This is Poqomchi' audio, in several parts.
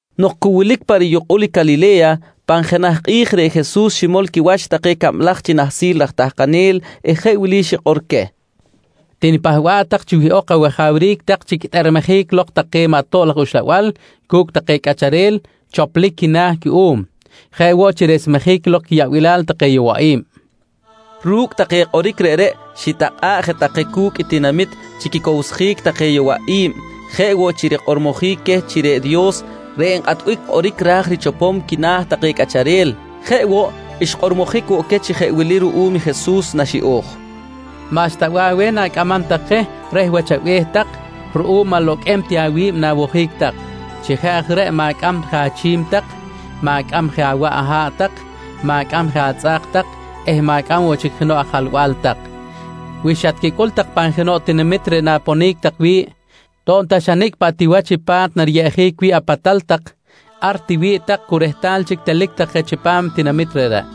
Nok cu wilic pa riyukꞌul Calile̱ya, pan jenaj kꞌi̱j reꞌ Jesus ximol quiwach take cablaj chi nahsil raj tahkanel eh jeꞌ wili xikꞌor queh: «Tinipahba̱ꞌ tak chi wihꞌok awajawric tak chi quitꞌermejic lok take maꞌ tob laj uxlabal cu̱cꞌ take cꞌacharel choplic quina̱ cuꞌum, jeꞌ woꞌ chi resmejic lok quiyaꞌbilal take yowaꞌi̱b, nqui queh. Ru̱cꞌ take kꞌoric reꞌreꞌ xitakꞌa̱ꞌ je take cu̱cꞌ i tinamit chi quicowsjic take yowaꞌi̱b jeꞌ woꞌ chi rikꞌormojic queh chi reꞌ Dios reꞌ nkꞌatbic kꞌoric ra̱j richopom quina̱ take cꞌacharel. Jeꞌ woꞌ, xkꞌormojic woꞌ queh chi jeꞌ wili ruꞌum Jesus naxiꞌo̱j: «Maꞌxta bih aweh tak na̱cꞌamam tak je reh wach abe̱h tak ruꞌum aloqꞌuem ti awi̱b na̱wojic tak. Chi jeꞌ aj reꞌ ma̱cꞌam je achꞌimim tak, ma̱cꞌam je awaꞌ aha̱ꞌ tak, ma̱cꞌam je atzꞌa̱k tak eh ma̱cꞌam woꞌ chic jenoꞌ ajalba̱l tak. Wi xatquicꞌul pan jenoꞌ tinamit reꞌ na̱ponic tak wi̱ꞌ, to̱b ta xa nicꞌ paꞌ ti wach i pa̱t nariyeꞌjic wi̱ꞌ apatal tak, ar tiwi̱ꞌ tak cu rehtal chic telic tak je chipam tinamit reꞌreꞌ.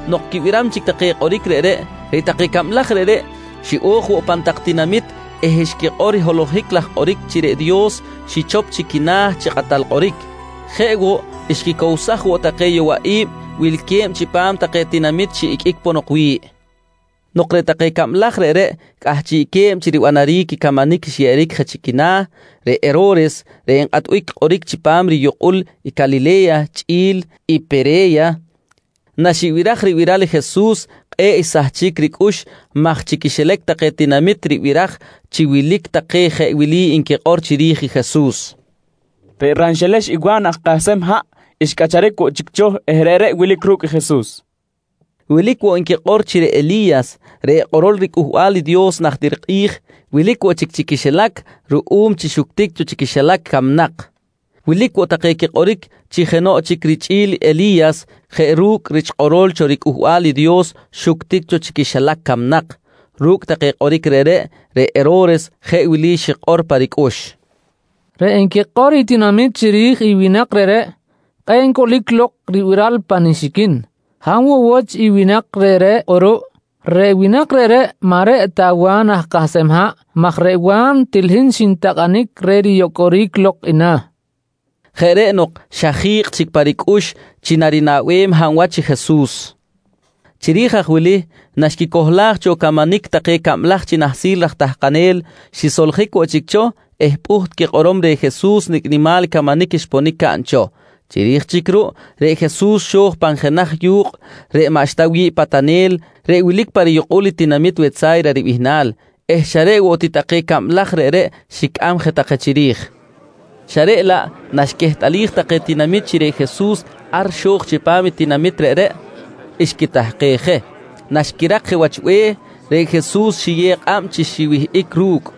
Nok quibiram chic take kꞌoric reꞌreꞌ, reꞌ take cablaj reꞌreꞌ xiꞌo̱j woꞌ pan tak tinamit eh xquikꞌor i holohic laj kꞌoric chi reꞌ Dios xichop chic quina̱ chi kꞌatal kꞌoric. Jeꞌ woꞌ, xquicowsaj woꞌ take yowaꞌi̱b wilque̱b chipam take tinamit xiꞌiqꞌuic ponok wi̱ꞌ. Nok reꞌ take cablaj reꞌreꞌ cꞌahchiꞌque̱b chi ribanaric i camanic xyeꞌeric je chi quina̱, reꞌ Hero̱res reꞌ nkꞌatbic kꞌoric chipam riyukꞌul Calile̱ya chꞌi̱l i Pere̱ya, naxibiraj ribiral i Jesus kꞌe̱ꞌ naxsahchic ricꞌux maj chi quixilac take tinamit ribiraj chi wilic take jeꞌ wili nquikꞌor chiri̱j i Jesus: «Reꞌ ranxelex i Wa̱n aj kahsem haꞌ xcꞌacharic woꞌ chic cho eh reꞌreꞌ wilic ru̱cꞌ i Jesus, nqui nquikꞌor. Wilic woꞌ nquikꞌor chi reꞌ Eli̱yas reꞌ kꞌorol riCꞌuhbal i Dios najtir kꞌi̱j wilic woꞌ chic chi quixilac ruꞌum chi xuctic cho chi quixilac camnak. Wilic woꞌ take quikꞌoric chi jenoꞌ chic richꞌi̱l i Eli̱yas jeꞌ ru̱cꞌ rich kꞌorol cho riCꞌuhbal i Dios xuctic woꞌ cho chi quixilac camnak. Ru̱cꞌ take kꞌoric reꞌreꞌ, reꞌ Hero̱res jeꞌ wili xikꞌor pa ricꞌux: «Reꞌ nquikꞌor i tinamit chiri̱j i winak reꞌreꞌ kꞌe̱ꞌ ncꞌulic lok ribiral pa nixiquin. Hab woꞌ wach i winak reꞌreꞌ kꞌuruꞌ? Reꞌ winak reꞌreꞌ maꞌ reꞌ ta Wa̱n aj kahsem haꞌ maj reꞌ Wa̱n til hin xintakꞌanic reh riyocꞌoric lok i na̱, nqui pa ricꞌux. Jeꞌ reꞌ nok, xa ji̱kꞌ chic pa ricꞌux chi narinaꞌbem hab wach i Jesus. Chiri̱j aj wili naxquicohlaj cho camanic take cablaj chi nahsil raj tahkanel, xisoljic woꞌ chic cho eh pꞌuht quikꞌorom reh Jesus nicꞌ nimal i camanic xponic caꞌn cho. Chiri̱j chic ruꞌ reꞌ Jesus xo̱j pan jenaj yu̱kꞌ reꞌ maꞌxta wi̱ꞌ patanel reꞌ wilic pa riyukꞌul tinamit Wetsa̱yra ribihnal eh xa reꞌ woꞌ ti take cablaj reꞌreꞌ xicꞌam je take chiri̱j xa reꞌ laꞌ naxquehtꞌalij take tinamit chi reꞌ Jesus ar xo̱j chipam tinamit reꞌreꞌ, xquitahkej je. Naxquirak je wach be̱h, reꞌ Jesus xiyew kꞌab queh chi xiwihꞌic ru̱cꞌ.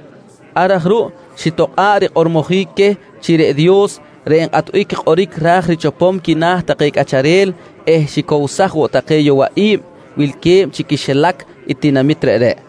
Ar aj ruꞌ xitokꞌa̱ꞌ rikꞌormojic queh chi reꞌ Dios reꞌ nkꞌatbic kꞌoric ra̱j richopom quina̱ take cꞌacharel eh xicowsaj woꞌ take yowaꞌi̱b wilque̱b chi quixilac i tinamit reꞌreꞌ.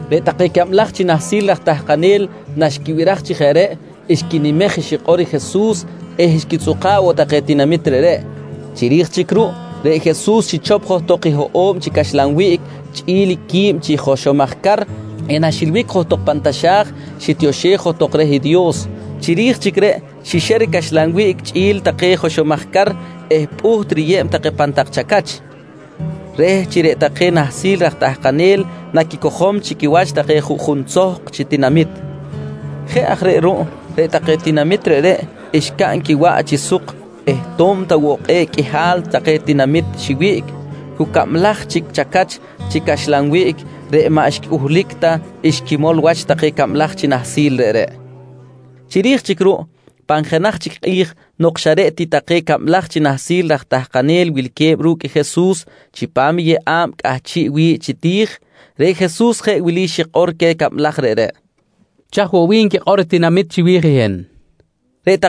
Reꞌ take cablaj chi nahsil raj tahkanel naxquibiraj chi jeꞌ reꞌ, xquinimej xikꞌor i Jesus eh xquitzꞌuka̱ꞌ woꞌ take tinamit reꞌreꞌ. Chiri̱j chic ruꞌ reꞌ Jesus xichop johtok i hoꞌo̱b chi caxlan wiꞌc chꞌi̱l quib chi joxomaj car eh naxilbic johtok pan taxa̱j xitioxej johtok reh i Dios. Chiri̱j chic reꞌ xixer i caxlan wiꞌc chꞌi̱l take joxomaj car reꞌreꞌ eh pꞌuht riyeb take pan tak chacach, reh chi reꞌ take nahsil raj tahkanel naquicojom chi quiwach take juꞌjun tzohk chi tinamit. Jeꞌ aj reꞌ ruꞌ reꞌ take tinamit reꞌreꞌ xcaꞌn quiwaꞌ chi suk eh to̱b ta woꞌ kꞌe̱ꞌ qꞌuihal take tinamit xiwiꞌc, cu cablaj chic chacach chi caxlan wiꞌc reꞌ maꞌ xcꞌuhlic ta xquimol wach take cablaj chi nahsil reꞌreꞌ. Chiri̱j chic ruꞌ pan jenaj chic kꞌi̱j nok xa reꞌ ti take cablaj chi nahsil raj tahkanel wilque̱b ru̱cꞌ Jesus chipam i yeꞌa̱b cꞌahchiꞌ wi̱ꞌ chi ti̱j, reꞌ Jesus jeꞌ wili xikꞌor queh cablaj reꞌreꞌ: «Chaj woꞌ bih nquikꞌor i tinamit chiwi̱j i hin? nqui queh.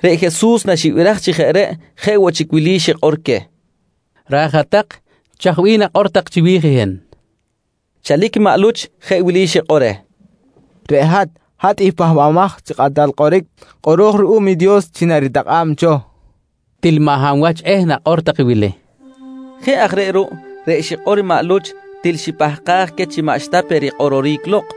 Reꞌ Jesus naxibiraj chi jeꞌ reꞌ, jeꞌ woꞌ chic wili xikꞌor queh: «Raj hat-tak, chaj bih nakꞌor tak chiwi̱j hin? nqui queh. Chalic maꞌ Luch jeꞌ wili xikꞌor reh: «Reꞌ hat, hat i Pahbamaj chi Kꞌatal Kꞌoric kꞌoro̱j ruꞌum i Dios chi naritakꞌa̱b cho, nqui reh. —Til maꞌ hab wach eh nakꞌor tak i wili, nqui Jesus queh. Jeꞌ aj reꞌ ruꞌ reꞌ xikꞌor maꞌ Luch til xipahkaj queh chi maꞌxta pe rikꞌororic lok.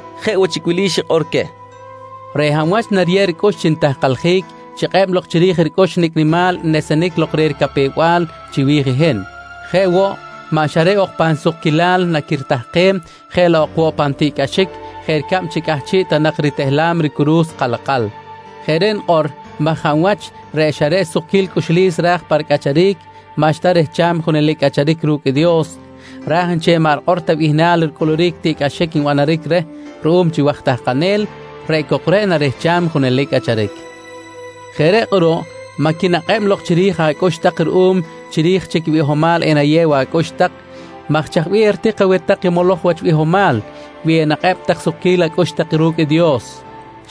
Chiri̱j reꞌreꞌ, jeꞌ woꞌ chic wili xikꞌor queh: «Reꞌ hab wach nariyeb ricꞌux chi nitahkaljic chikꞌeb lok chiri̱j ricꞌux nicꞌ nimal nesenic lok reh ricapew-bal chiwi̱j i hin. Jeꞌ woꞌ, maꞌ xa reꞌ ok pan sukquilal naquiritahkem, jeꞌ laꞌ ok woꞌ pan tiꞌcꞌaxic jeꞌ ricab chi cꞌahchiꞌ ta nak ritehlam ricuru̱s kalakal. Jeꞌ reꞌ nikꞌor maj hab wach reꞌ xa reꞌ sukquil cꞌuxlis ra̱j pa ricꞌacharic, maꞌxta rehcham i junelic cꞌacharic ru̱cꞌ i Dios raj nchel i maꞌ rikꞌor ta bihnal ricꞌuluric i tiꞌcꞌaxic nbanaric reh ruꞌum chi waj tahkanel, reꞌ cok reꞌ narehcham i junelic cꞌacharic. Jeꞌ reꞌ kꞌuruꞌ maꞌ quinakꞌeb lok chiri̱j acꞌux tak ruꞌum chi chiri̱j chic i bihomal enayew acꞌux tak maj chaj bih eritik aweh tak i moloj wach bihomal, wi enakꞌeb tak i sukquil acꞌux tak ru̱cꞌ i Dios?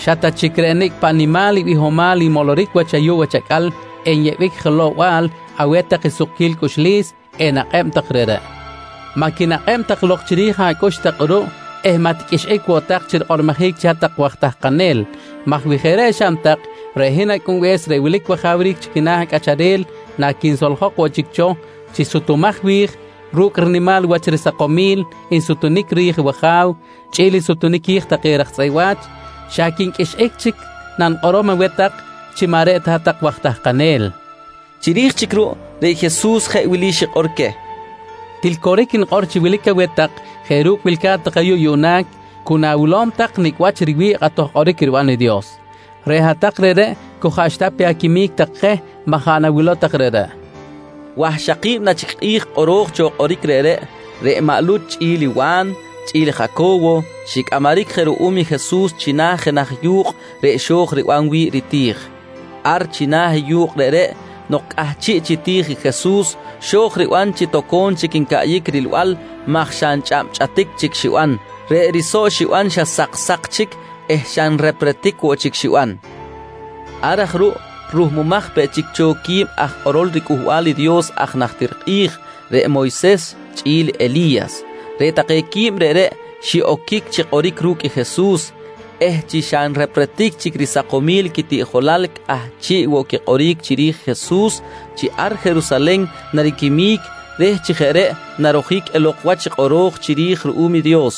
Xa ta chic reꞌ nicꞌ paꞌ nimal i bihomal nmoloric wach ayuꞌ wach acꞌal enyeꞌbic jelow-bal aweh tak i sukquil cꞌuxlis enakꞌeb tak reꞌreꞌ! «Maꞌ quinakꞌeb tak lok chiri̱j acꞌux tak kꞌuruꞌ eh maꞌ tiqꞌuixꞌic woꞌ tak chi rikꞌormojic chi hat-tak waj tahkanel maj wi jeꞌ reꞌ xaꞌn tak, reꞌ hin Acꞌunbe̱s reꞌ wilic wajawric chi quina̱ cꞌacharel naquinsoljok woꞌ chic cho chi sutumaj wi̱j ru̱cꞌ rinimal wach sakomil nsutunic ri̱j i wAja̱w chꞌi̱l nsutunic qui̱j take raj tzꞌeꞌ wa̱ch, xa quinqꞌuixꞌic chic nanikꞌorom woꞌ aweh tak chi maꞌ reꞌ ta hat-tak waj tahkanel, nqui Jesus. Chiri̱j chic ruꞌ, reꞌ Jesus jeꞌ wili xikꞌor queh: «Til coric nikꞌor chi wilic aweh tak jeꞌ ru̱cꞌ wilca̱t tak ayuꞌ yuꞌna cu na̱wilom tak nicꞌ wach riwi̱ꞌ kꞌatoj kꞌoric riban i Dios. Reꞌ hat-tak reꞌreꞌ cu jaꞌxta pe aquimic tak je maꞌ jaꞌ nawilow tak reꞌreꞌ, nqui queh. Wahxaki̱b na chic kꞌi̱j kꞌoro̱j cho kꞌoric reꞌreꞌ, reꞌ maꞌ Luch chꞌi̱l i Wa̱n chꞌi̱l i Jaco̱wo xicꞌamaric je ruꞌum i Jesus china̱ jenaj yu̱kꞌ reꞌ xo̱j riban wi̱ꞌ riti̱j. Ar china̱ i yu̱kꞌ reꞌreꞌ nok cꞌahchiꞌ chi ti̱j i Jesus, xo̱j riban chi toco̱m chic ncaꞌyic rilbal maj xa nchꞌabchꞌatic chic xiban. Reꞌ risoꞌ xiban xa saksa̱k chic eh xa nrepretic woꞌ chic xiban. Ar aj ruꞌ ruhmumaj peꞌ chic cho quib aj kꞌorol riCꞌuhbal i Dios aj najtir kꞌi̱j, reꞌ Moyses chꞌi̱l Eli̱yas. Reꞌ take quib reꞌreꞌ xiꞌoquic chi kꞌoric ru̱cꞌ i Jesus eh chi xa nrepretic chic sakomil quitiꞌjolal cꞌahchiꞌ woꞌ quikꞌoric chiri̱j i Jesus chi ar Jerusalen nariquimic reh chi jeꞌ reꞌ narojic elok wach reꞌ kꞌoro̱j cho chiri̱j ruꞌum i Dios.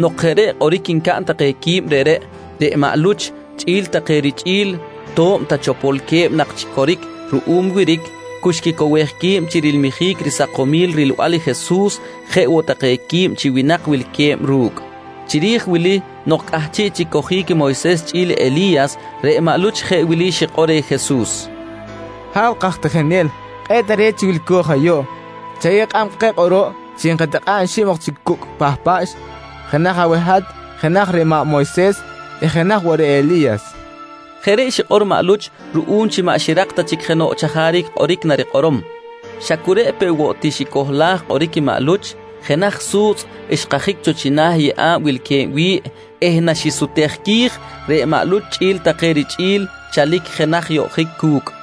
Nok jeꞌ reꞌ kꞌoric ncaꞌn take qui̱b reꞌreꞌ, reꞌ maꞌ Luch chꞌi̱l take richꞌi̱l to̱b ta chopolque̱b nak chi coric ruꞌum wiric, cu xquicowej qui̱b chi rilmijic risakomil rilbal i Jesus jeꞌ woꞌ take quib chi winak wilque̱b ru̱cꞌ. Chiri̱j wili nok cꞌahchiꞌ chic cojic Moyses chꞌi̱l Eli̱yas, reꞌ maꞌ Luch jeꞌ wili xikꞌor reh Jesus: «Ha̱w kaj tijinel, kꞌe̱ꞌ tare̱t chi wilco̱j ayuꞌ. Chayew kꞌab keh kꞌuruꞌ chi enkatikꞌa̱ꞌ xib ok chi cucꞌ pahpaꞌx. Jenaj aweh hat, jenaj reh maꞌ Moyses eh jenaj woꞌ reh Eli̱yas, nqui reh. Jeꞌ reꞌ xikꞌor maꞌ Luch ruꞌum chi maꞌ xirak ta chic jenoꞌ chajaric kꞌoric narikꞌorom. Xa cu reꞌ peꞌ woꞌ ti xicohlaj kꞌoric i maꞌ Luch, jenaj su̱tzꞌ xkajic cho china̱ i yeꞌa̱b wilque̱b wi̱ꞌ eh naxisutej qui̱j, reꞌ maꞌ Luch chꞌi̱l take richꞌi̱l chalic jenaj yoꞌjic cu̱cꞌ.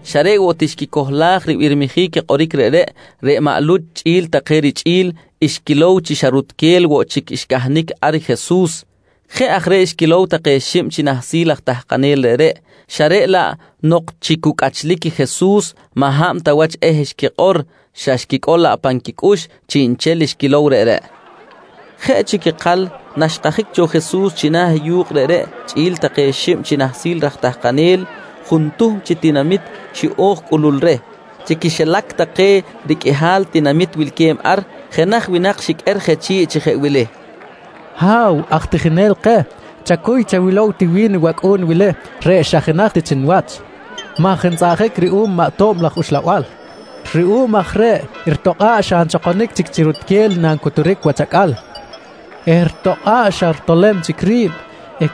Xa reꞌ woꞌ xquicohlaj ribirmijic i kꞌoric reꞌreꞌ, reꞌ maꞌ Luch chꞌi̱l take richꞌi̱l xquilow chi xa rutquel woꞌ chic xcahnic ar i Jesus. Jeꞌ aj reꞌ xquilow take xib chi nahsil aj tahkanel reꞌreꞌ, xa reꞌ laꞌ nok chi cu cꞌachlic i Jesus maꞌ hab ta wach eh xquikꞌor xa xquicꞌol laꞌ pan quicꞌux chiꞌnchel xquilow reꞌreꞌ. Jeꞌ chic ikal naxkajic cho Jesus china̱ yu̱kꞌ reꞌreꞌ chꞌi̱l take xib chi nahsil raj tahkanel, juntuhm chi tinamit xiꞌo̱j cꞌulul reh. Chi quixilac take riqꞌuihal tinamit wilque̱b ar, jenaj winak xiqꞌuer je chi̱ꞌ chi jeꞌ wili: «Ha̱w aj tijinel keh, chacuy chawilow ti wi̱n wacꞌu̱n wili reꞌ xa jenaj ti chi niwach maj ntzꞌaꞌjic ruꞌum maꞌ tob laj uxlabal. Ruꞌum aj reꞌ ritokꞌa̱ꞌ xa nchokonic chic chi rutquel nancuturic wach acꞌal eh ritokꞌa̱ꞌ xa ritolem chic ri̱b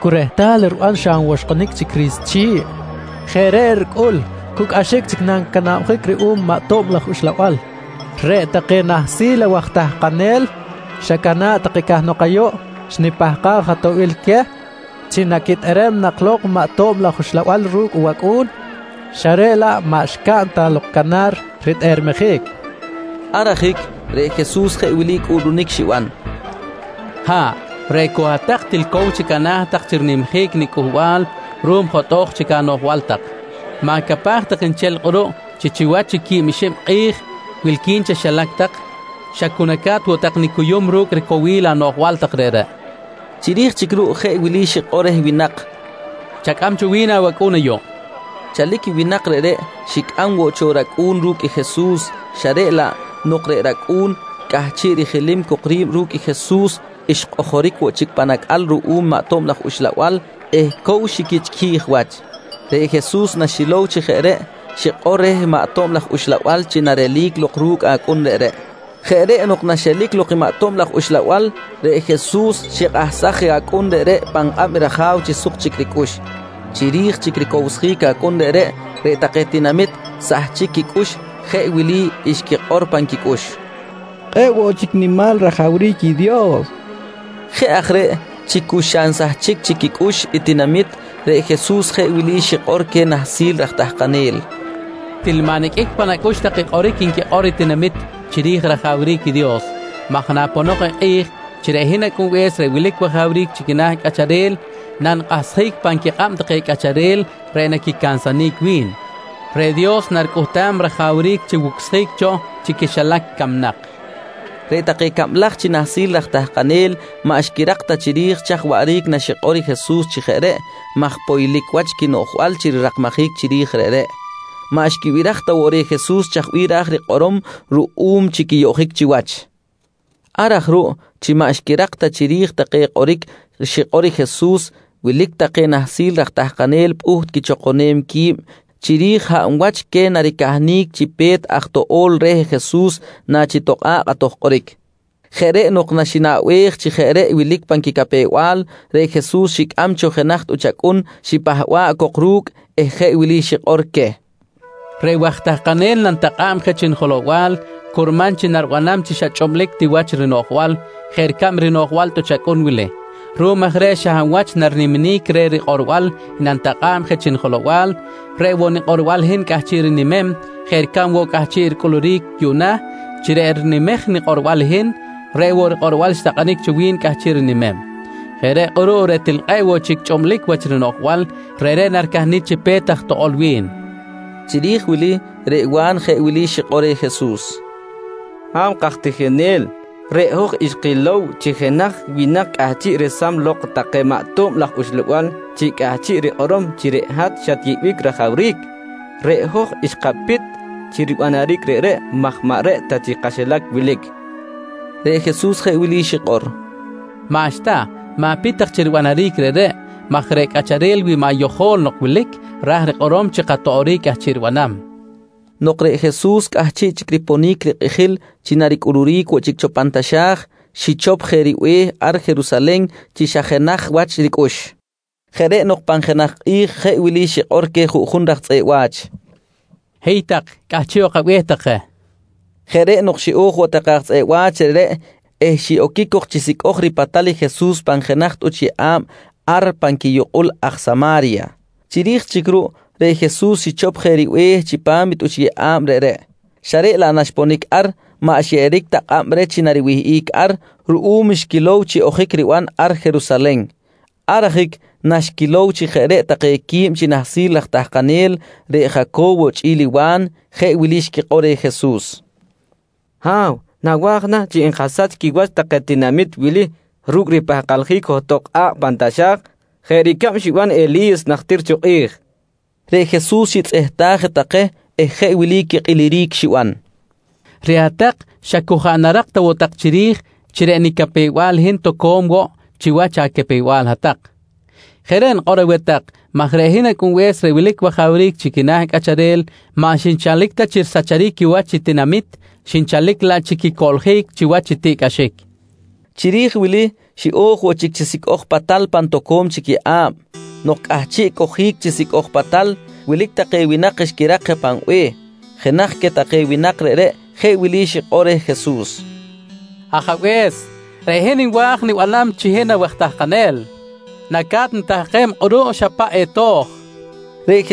cu rehtal riban xa nwoxkꞌonic chic ri̱s chi̱ꞌ. Jeꞌ reꞌ ricꞌul, cu cꞌaxic chic nancanabjic ruꞌum maꞌ tob laj uxlabal. Reꞌ take nahsil awaj tahkanel xacana̱ꞌ take cahnok ayuꞌ xnipahkaj atoꞌbil queh chi naquitꞌerem nak lok maꞌ tob laj uxlabal ru̱cꞌ i wacꞌu̱n xa reꞌ laꞌ maꞌ xcaꞌn ta lok canar ritꞌermejic, nqui reh Jesus. Ar ajic reꞌ Jesus jeꞌ wili cꞌuꞌlunic xiban: «Ha̱ꞌ, reꞌ cok hat-tak til cow chic ana̱ tak chi rinimjic nicꞌuhbal ruꞌum jotꞌo̱j chic anoꞌjbal tak! Ma̱capaj tak nchel kꞌuruꞌ chi chiwach i quib xib chic kꞌi̱j wilqui̱n chaxilac tak xa cu naca̱t woꞌ tak nicuyum ru̱cꞌ ricowil anoꞌjbal tak reꞌreꞌ, nqui quikꞌilmijic xiban. Chiri̱j chic ruꞌ jeꞌ wili xikꞌor reh winak: «Chacꞌam cho wi̱n awacꞌu̱n ayuꞌ, nqui reh. Chalic i winak reꞌreꞌ xicꞌam woꞌ cho i racꞌu̱n ru̱cꞌ i Jesus, xa reꞌ laꞌ nok reꞌ racꞌu̱n cꞌahchiꞌ rijilim cok ri̱b ru̱cꞌ Jesus, xkꞌojoric woꞌ chic pan acꞌal ruꞌum maꞌ tob laj uxlabal eh cow xiquichꞌquij wach. Reꞌ Jesus naxilow chi jeꞌ reꞌ, xikꞌor reh maꞌ tob laj uxlabal chi narelic lok ru̱cꞌ acꞌun reꞌreꞌ. Jeꞌ reꞌ nok naxelic lok i maꞌ tob laj uxlabal, reꞌ Jesus xikꞌahsaj je acꞌun reꞌreꞌ pan kꞌab i raja̱w chi suk chic ricꞌux. Chiri̱j chic ricowsjic acꞌun reꞌ, reꞌ take tinamit sahchic quicꞌux jeꞌ wili xquikꞌor pan quicꞌux: «Kꞌe̱ꞌ woꞌ chic nimal rajawric i Dios, nqui take. Jeꞌ aj reꞌ chi cu xa nsahchic chic quicꞌux i tinamit, reꞌ Jesus jeꞌ wili xikꞌor queh nahsil raj tahkanel: «Til maꞌ niqꞌuic pan acꞌux tak i kꞌoric nquikꞌor i tinamit chiri̱j i rajawric i Dios maj naponok i kꞌi̱j chi reꞌ hin Acꞌunbe̱s reꞌ wilic wajawric chi quina̱ cꞌacharel nanikꞌahsjic pan quikꞌab take cꞌacharel reꞌ naquicansanic wi̱n, reꞌ Dios naricꞌuhtam rajawric chi wucsjic cho chi quixilac camnak, nqui queh. Reꞌ take cablaj chi nahsil raj tahkanel maꞌ xquirak ta chiri̱j chaj waꞌric naxikꞌor i Jesus chi jeꞌ reꞌ maj poylic wach quinoꞌjbal chi rirakmajic chiri̱j reꞌreꞌ. Maꞌ xquibiraj ta woꞌ reh Jesus chaj bih ra̱j rikꞌorom ruꞌum chi quiyoꞌjic chiwach. Ar aj ruꞌ chi maꞌ xquirak ta chiri̱j take kꞌoric xikꞌor i Jesus, wilic take nahsil raj tahkanel pꞌuht quichokonem qui̱b chiri̱j hab wach queh naricahnic chi pe̱t aj toꞌo̱l reh Jesus nachitokꞌa̱ꞌ kꞌatoj kꞌoric. Jeꞌ reꞌ nok naxinaꞌbej chi jeꞌ reꞌ wilic pan quicapew-bal reꞌ Jesus xicꞌam cho jenaj tꞌuch acꞌun, xipahba̱ꞌ cok ru̱cꞌ eh jeꞌ wili xikꞌor queh: «Reꞌ waj tahkanel nanitakꞌa̱b je chi nijelow-bal curman chi naribanam chi xa chꞌublic ti wach rinoꞌjbal jeꞌ ricab rinoꞌjbal i tꞌuch acꞌun wili. Ruꞌum aj reꞌ xa hab wach nariniminic reh rikꞌorbal i nanitakꞌa̱b je chi nijelow-bal, reꞌ woꞌ nikꞌorbal i hin cꞌahchiꞌ rinimem jeꞌ ricab woꞌ cꞌahchiꞌ ricꞌuluric yuꞌna chi reꞌ rinimej nikꞌorbal i hin, reꞌ woꞌ rikꞌorbal xtakꞌanic cho wi̱n cꞌahchiꞌ rinimem. Jeꞌ reꞌ kꞌuruꞌ reꞌ til kꞌe̱ꞌ woꞌ chic chꞌublic wach rinoꞌjbal, reꞌreꞌ naricahnic chi pe̱t aj toꞌo̱l wi̱n, nqui queh. Chiri̱j wili, reꞌ Wa̱n jeꞌ wili xikꞌor reh Jesus: «Ha̱w kaj tijinel, reꞌ hoj xkilow chi jenaj winak cꞌahchiꞌ resam lok take maꞌ tob laj uxlabal chi cꞌahchiꞌ rikꞌorom chi reꞌ hat xatyeꞌbic rajawric. Reꞌ hoj xkapit chi ribanaric reꞌreꞌ maj maꞌ reꞌ ta chi kaxilac wilic, nqui take reh. Reꞌ Jesus jeꞌ wili xikꞌor: «Maꞌxta, ma̱pit tak chi ribanaric reꞌreꞌ maj reꞌ cꞌacharel wi maꞌ yojo̱l nok wilic, ra̱j rikꞌorom chi katoꞌoric cꞌahchiꞌ ribanam, nqui Jesus. Nok reꞌ Jesus cꞌahchiꞌ chic riponic rikꞌijil chi naricꞌuluric woꞌ chic cho pan taxa̱j, xichop je ribe̱h ar Jerusalen chi xa jenaj wach ricꞌux. Jeꞌ reꞌ nok pan jenaj kꞌi̱j jeꞌ wili xikꞌor queh juꞌjun raj tzꞌeꞌ wa̱ch: «Hiy tak, cꞌahchiꞌ ok abe̱h tak je, nqui queh. Jeꞌ reꞌ nok xiꞌo̱j woꞌ take aj tzꞌeꞌ wa̱ch reꞌreꞌ eh xiꞌoquic cok chi sicꞌoj ripatal i Jesus pan jenaj tꞌuch yeꞌa̱b ar pan quiyukꞌul aj Sama̱rya. Chiri̱j chic ruꞌ, reꞌ Jesus xichop je ribe̱h chipam tꞌuch yeꞌa̱b reꞌreꞌ, xa reꞌ laꞌ naxponic ar maꞌ xyeꞌeric ta kꞌab reh chi nariwihꞌic ar ruꞌum xquilow chi ojic riban ar Jerusalen. Ar ajic naxquilow chi jeꞌ reꞌ take quib chi nahsil aj tahkanel, reꞌ Jaco̱wo chꞌi̱l i Wa̱n, jeꞌ wili xquikꞌor reh Jesus: «Ha̱w, nawa̱j chi enkasach quiwach take tinamit wili ru̱cꞌ ripahkaljic johtok kꞌa̱kꞌ pan taxa̱j jeꞌ ricab xiban i Eli̱yas najtir cho kꞌi̱j reh? nqui take reh. Reꞌ Jesus xitzꞌehtaj je take eh jeꞌ wili quikꞌiliric xiban: «Reꞌ hat-tak xa cu jaꞌ narak ta woꞌ tak chiri̱j chi reꞌ nicapew-bal hin toco̱m woꞌ chiwach acapew-bal hat-tak. Jeꞌ reꞌ nikꞌor aweh tak maj reꞌ hin Acꞌunbe̱s reꞌ wilic wajawric chi quina̱ cꞌacharel maꞌ xinchalic ta chi risacharic quiwach i tinamit, xinchalic laꞌ chi quicoꞌljic chiwach i tiꞌcꞌaxic, nqui queh. Chiri̱j wili xiꞌo̱j woꞌ chic chi sicꞌoj patal pan toco̱m chic yeꞌa̱b. Nok cꞌahchiꞌ cojic chi sicꞌoj patal, wilic take winak xquirak je pan be̱h. Jenaj queh take winak reꞌreꞌ jeꞌ wili xikꞌor reh Jesus: «Ajabe̱s, reꞌ hin nwa̱j nibanam chi hin awaj tahkanel. Naca̱t nitahkem kꞌuruꞌ xa paꞌ eto̱j, nqui reh.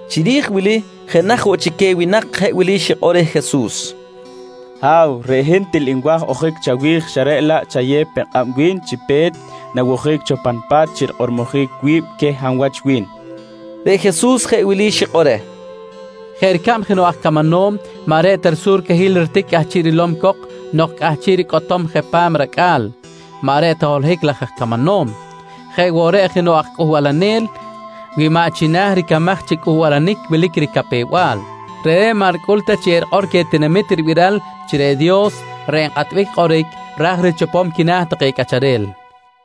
Chiri̱j wili jenaj woꞌ chic queh winak jeꞌ wili xikꞌor reh Jesus: «Ha̱w, reꞌ hin til nwa̱j ojic chawi̱j xa reꞌ laꞌ chayew pe kꞌab wi̱n chi pe̱t nawojic cho pan pa̱t chi rikꞌororic wi̱b queh hab wach wi̱n, nqui reh. Reꞌ Jesus jeꞌ wili xikꞌor reh: «Jeꞌ ricab jenoꞌ aj camanom maꞌ reꞌ ta risurcahil ritic cꞌahchiꞌ rilom cok nok cꞌahchiꞌ ricꞌotom je pan racꞌa̱l, maꞌ reꞌ ta holohic laj aj camanom, jeꞌ woꞌ reꞌ jenoꞌ aj cꞌuhbalanel wi maꞌ china̱ ricamaj chi cꞌuhbalanic wilic ricapew-bal, reꞌreꞌ maꞌ ricꞌul ta chi erikꞌor queh tinamit i ribiral chi reꞌ Dios reꞌ nkꞌatbic kꞌoric ra̱j richopom quina̱ take cꞌacharel, nqui Jesus.